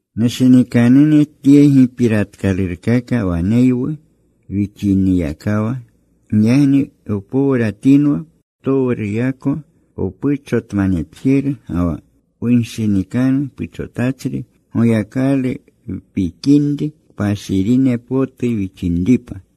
Nushinikanune, tye gipiratkalurkaka waneywu wixiniyakawa. Giyagni wpowratinwa ptowruyako wpuchotmanetjeru ga wa wunshinikanu puchotachri. Goyakalu wpikinri, kpashirine potu wixinripa.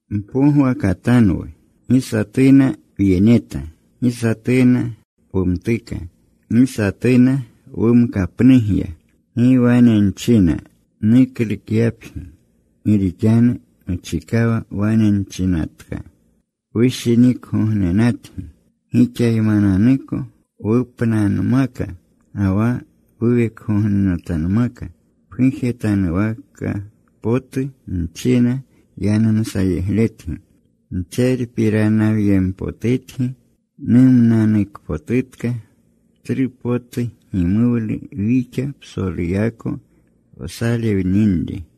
Mpogwakatanwu. Gi satuna wyeneta. Gi satuna wumtuka. Gi satuna wumkapnugya. Gi wane nchina nuklukyapgi. Gi rixanu muchikawa wane nchinatka, wushinikgognenatgi. Gixaymananuko wupnanmaka ga wa wuwekgognenatanmaka. Pgujetanwaka potu nchina yanumsayegletgi. Ntserpiranawyempotutgi. Numnanukpotutka. Tsru potu gimuwlu wixa psoluyako wsalewninri.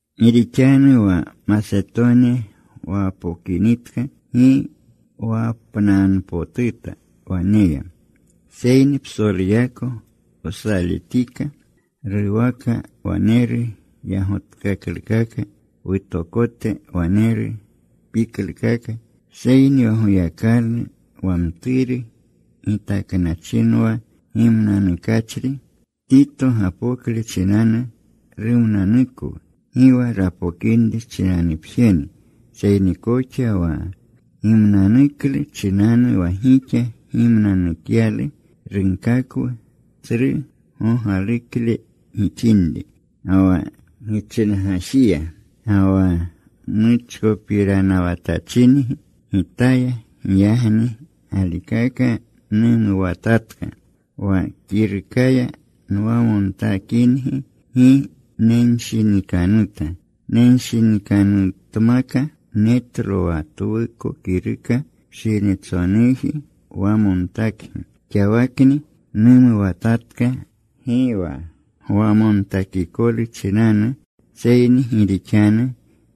Gi rixanu wa Masetoni wapokinitka gi wapnanmanpotuta waneya. Seyni psoluyako wsaletika. Ruwaka waneru yagotkaklukaka. Wutokote waneru piklukaka. Seyni wa Goyakalu wa mturu gitaknachinwa gimnanukachri, Tito gapokle chinanu rumnanukwu. Gi wa rapokinri chinanupjeni, seyni koxa wa gimnanuklu chinanu wa gixa gimnanukyalu. Runkakwu tsru gogalukle gixinri, ga wa gichingajiya, ga wa muchkopiranawatachingi gitaya. Giyagni galikaka numuwatatka. Wa kirukaya nwamontakingi, gi nenshinikanuta. Nenshinikanutmaka. Netlo wa twuko kiruka pshinitsonuji wamontakgi. Xawakni numuwatatka, gi wa gwamontakikolu chinanu, seyni gi rixanu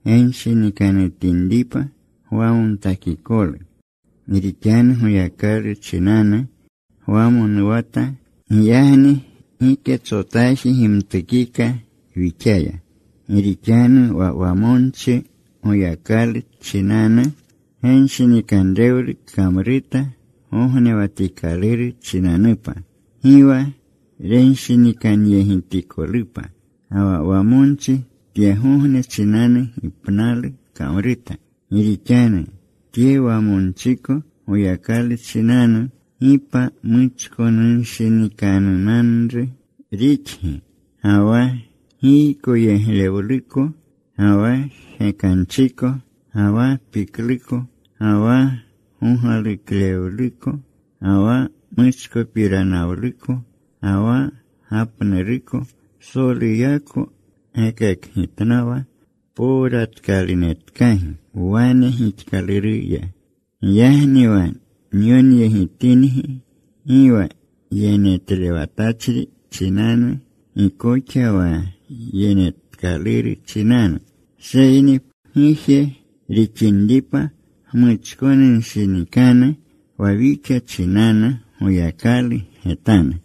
genshinikanutinripa gwamontakikolu. Gi rixanu Goyakalu chinanu gwamonuwata. Giyagni giketsotaji gimtukika wixaya. Gi rixanu wa wamonchi Goyakalu chinanu genshinikanrewlu kamruta gognewatikaluru chinanupa. Gi wa renshinikanyegitikolupa. Ga wa wamonchi tyegogne chinanu gipnalu kamruta. Gi rixanu tye wamonchiko Goyakalu chinanu, ¡gi pa muchkonunshinikanunanru rixgi! Ga wa giykoyeglewluko, ga wa jgekanchiko, ga wa pikluko, ga wa gogaluklewluko, ga wa muchkopiranawluko, ga wa gapnuruko. Psoluyako gekakgitnawa powratkalunetkagi wane gixkaluruya. Giyagni wa nyonyegitingi, gi wa yenetlewatachri chinanu, gi koxa wa yenetkaluru chinanu. Seyni pguje rixinripa gmuchkonunshinikanu wa wixa chinanu Goyakalu getanu.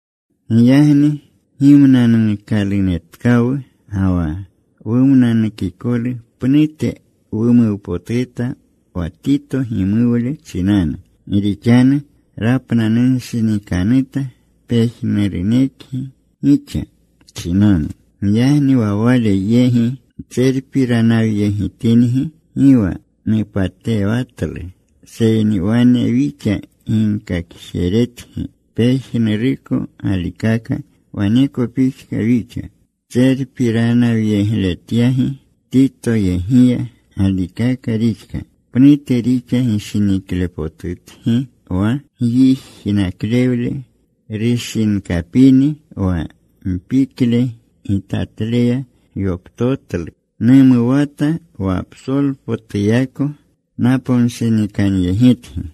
Giyagni gimnanuukalunetkawu. Ga wa wumnanukikolu pnute wumuwpotuta wa Tito gimuwle chinanu. Gi rixanu rapnanunshinikanuta pejnurunekgi gixa chinanu. Giyagni wa wale yegi ntserpiranawyegitingi gi wa nupatewatlu. Seyni wane wixa ginkakjeretgi pejnuruko galikaka, waneko pixka wixa tserpiranawyegletyagi Titoyegiya. Galikaka rixka. Pnute rixa gishiniklepotutgi wa gyijnaklewle rushinkapini, wa mpikle gitatleya gyoptotlu. Numuwata wa psolpotuyako naponshinikanyegitgi.